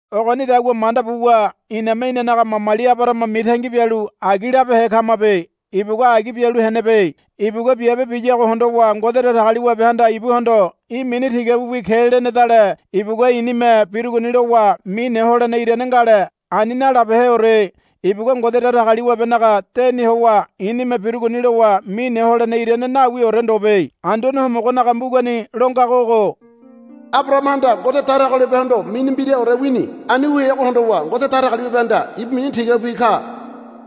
Ogonidagua manda buwa iname inanaga mamali Abarahama mitangi bialu agi labehe kamabe. Ibugua agi bialu henebe. Ibugua biabe biyago hondowa Ngode Datagaliwabehanda ibuhondo, Í̠ mini tigabiwi ke, lenedale ibugua i̱nime birugoni lowa mine holene irane ngale. Ani nalabeheore. Ibugua Ngode Datagaliwabenaga deni howa i̱nime birugoni lowa mine holene irane nawiore ndobe. Anduane Homogonaga mbugani lo ngago ogo, Abarahamahanda Ngode Datagaliwabehondo mini mbiraore wini. Ani wu heago hondowa Ngode Datagaliwabehanda, Ibu mini tigabiwi ka,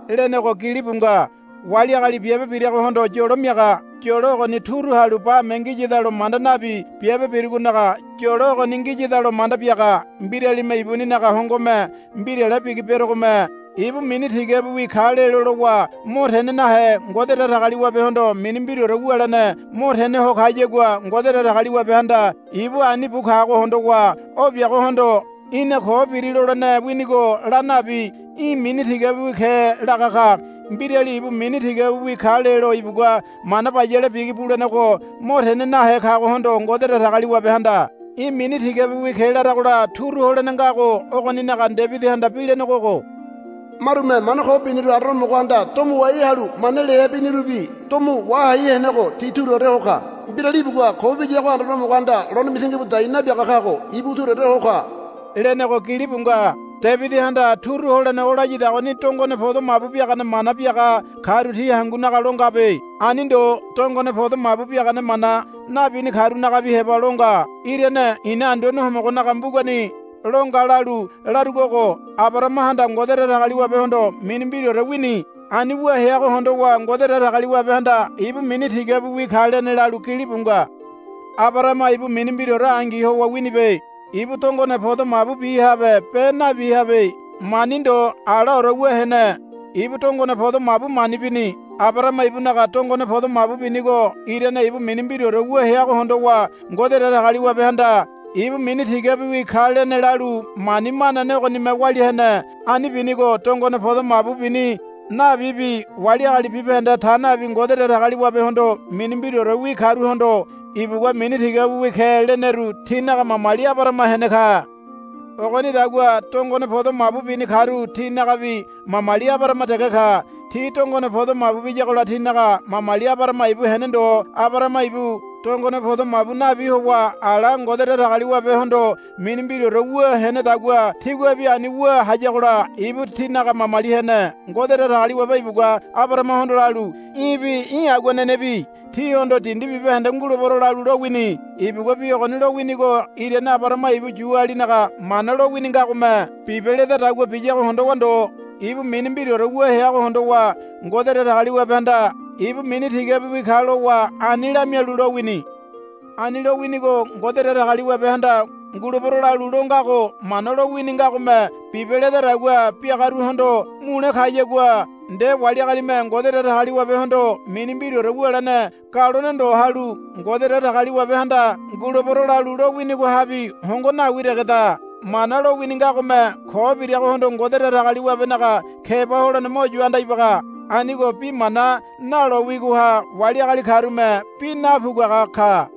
lenego gilibu nga. Wali agali biabe biragohondo yolo miaga. Yolo ogoni turu halu bame ngiyadalo manda nabi biabe birugonaga yolo ogoni ngiyadalo manda biaga. Mbiralime ibuninaga hongome mbirale bigi berogome ibu mini tigabiwi ka lelo lowa mo tene nahe Ngode Datagaliwabehondo mini mbiraore wulene mo tene ho kayagua Ngode Datagaliwabehanda ibu ani bu kago hondowa o biagohondo, Í̠na ko biri, lolene winigo la nabi, Í̠ mini tigabiwi ke, laga ka. Mbirali ibu mini tigabiwi ka lelo ibugua mana bayale bigi bulenego mo tene nahe kagohondo Ngode Datagaliwabehanda, Í̠ mini tigabiwi ke, laragola turu holene ngago ogoninaga Debidihanda bi lenego ogo, Marume mana ko biniru Anduane Homogohanda domo wahalu mana liahe binirubi domo wahai henego ti turuore ho ka. Mbirali ibugua ko biyago Anduane Homogohanda lone mitangi bu dai nabiaga kago ibu turuore ho ka, lenego gilibu nga. Debidihanda turu holene o layadagoni dongone podo mabu biagane mana biaga karu ti hangunaga lo ngabe. Ani ndo. Dongone podo mabu biagane mana nabini karunagabi heba lo nga. Irane i̱na Anduane Homogonaga mbugani lo nga lalu larugo ogo, Abarahamahanda Ngode Datagaliwabehondo mini mbiraore wini. Ani wu heago hondowa Ngode Datagaliwabehanda, Ibu mini tigabiwi ka, lene, lalu gilibu nga. Abarahama ibu mini mbiraore angi howa winibe. Ibu dongone podo mabu bihabe be nabihabe. Mani ndo alaore wu hene. Ibu dongone podo mabu mani bini. Abarahama ibunaga dongone podo mabu binigo irane ibu mini mbiraore wu heago hondowa Ngode Datagaliwabehanda, Ibu mini tigabiwi ka, lene lalu mani manane ogonime walia hene. Ani binigo dongone podo mabu bini nabibi wali agali bibahende ta nabi Ngode Datagaliwabehondo mini mbiraorewi karuhondo ibugua, Mini tigabiwi ke, leneru tinaga mamali Abarahama hene ka. Ogonidagua dongone podo mabu bini karu tinagabi mamali Abarahama dege ka. Ti dongone podo mabu biyagola tinaga mamali Abarahama ibu hene ndo. Abarahama ibu dongone podo mabu nabi howa ala Ngode Datagaliwabehondo mini mbiraore wu henedagua tiguabi ani wu hayagola ibu tinaga mamali hene. Ngode Datagaliwabe ibugua Abarahamahondo lalu, Í̠bi í̠ aguanenebi tíhondo dindi bibahende ngulebero lalu, lowini. Ibugua bi ogoni lowinigo irane Abarahama ibu Yualinaga Mana lowini ngagome, Bibe, ledadagua biyago hondowa ndo. Ibu mini mbiraore wu heago hondowa Ngode Datagaliwabehanda, Ibu mini tigabiwi ka, lowa ani lamialu lowini. Ani lowinigo Ngode Datagaliwabehanda, Ngulebero, lalu lo ngago Mana lo wini ngagome, Bibe, ledadagua biagaruhondo mule kayagua nde wali agalime Ngode Datagaliwabehondo mini mbiraore wulene galone ndo halu Ngode Datagaliwabehanda, Ngulebero, lalu lo winigohabi hongo nawi degeda. Mana lowini ngagome ko biragohondo Ngode Datagaliwabenaga keba holene mo yu anda ibaga. Anigo bi mana nalo wigoha wali agali karume bi napuguaga ka.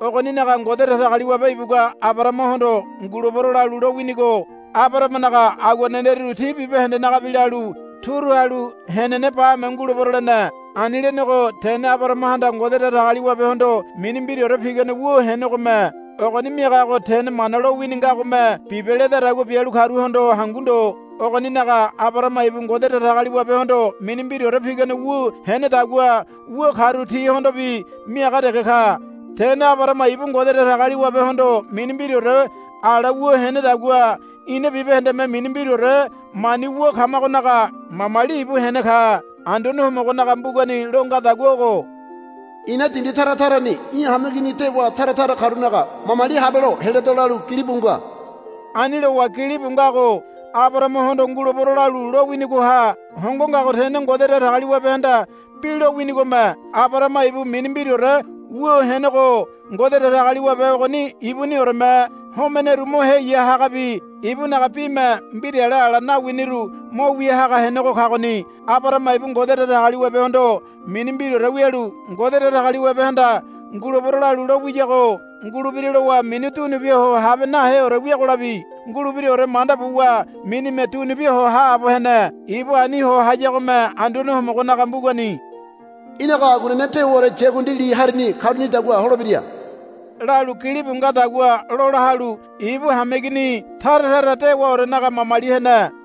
Ogoninaga Ngode Datagaliwabe ibugua Abarahamahondo, Ngulebero, lalu lowinigo Abarahamanaga aguaneneru ti bibahendenagabi lalu turu halu henene bame ngulebero lene. Ani lenego tene Abarahamahanda Ngode Datagaliwabehondo mini mbiraore pigane wu henegome. Ogoni miagago tene Mana lowini ngagome, Bibe, ledadagua bialu karuhondo hangu ndo. Ogoninaga Abarahama ibu Ngode Datagaliwabehondo mini mbiraore pigane wu henedagua wu karu tihondobi miaga dege ka. Tene Abarahama ibu Ngode Datagaliwabehondo mini mbiraore ala wu henedagua ina bibahendeme mini mbiraore mani wu kamagonaga mamali ibu hene ka. Anduane Homogonaga mbugani lo ngadagua ogo, I̱na dindi tara tarani í̠ hameigini dewa tara tara karunaga mamali habelo heledo, lalu gilibu nga. Ani lowa gilibu ngago Abarahamahondo, Ngulebero, lalu lo winigoha hongo ngago tene Ngode Datagaliwabehanda bi lo winigome. Abarahama ibu mini mbiraore wu henego Ngode Datagaliwabe ogoni ibunioreme homeneru mo heya hagabi ibunaga bime mbirale ala nawiniru mo wia hagabi henego kagoni. Abarahama ibu Ngode Datagaliwabehondo mini mbiraore wialu Ngode Datagaliwabehanda, Ngulebero, lalu lo wiyago ngulebira lowa mini dunubia ho habe naheore wiagolabi ngulebiraore manda buwa minime dunubia ho haabo hene. Ibu ani ho hayagome Anduane Homogonaga mbugani, Í̠naga aguanene dewaore yakundi li harini karunidagua holebira, lalu gilibu ngadagua lola halu ibu hameigini tara tara dewaorenaga mamali hene.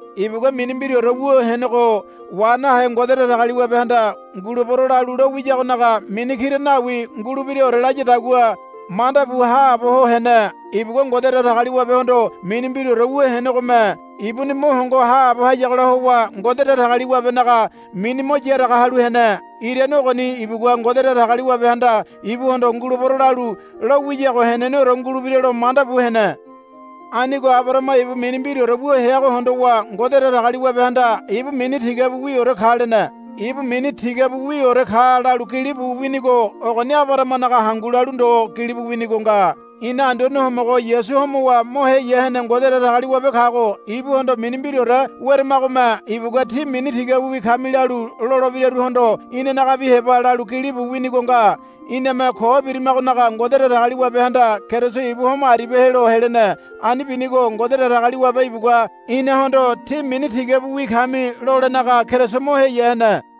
Ibugua mini mbiraore wu henego wa nahe Ngode Datagaliwabehanda, Ngulebero, lalu lo wiyagonaga mini kira nawi ngulebiraore layadagua manda bu haabo ho hene. Ibugua Ngode Datagaliwabehondo mini mbiraore wu henegome ibuni mo hongo haabo hayagola howa Ngode Datagaliwabenaga mini mo yaraga halu hene. Irane ogoni ibugua Ngode Datagaliwabehanda ibuhondo, Ngulebero, lalu lo wiyago heneneore ngulebira lo manda bu hene. Anigo Abarahama ibu mini mbiraore wu heago hondowa Ngode Datagaliwabehanda, Ibu mini tigabiwiore ka, lene. Ibu mini tigabiwiore ka, lalu gilibu winigo ogoni Abarahamanaga hangu lalu ndo gilibu winigo nga. Ina Anduane Homogo Yasu homowa mo heya hene Ngode Datagaliwabe kago ibuhondo mini mbiraore weramagome ibugua, Tí mini tigabiwi kami, lalu lolebiraruhondo inanagabi heba lalu gilibu winigo nga. Iname ko birimagonaga Ngode Datagaliwabehanda Keriso ibu homo aribia helo helene. Ani binigo Ngode Datagaliwabe ibugua inahondo, Tí mini tigabiwi kami, lolenaga Keriso mo heya hene.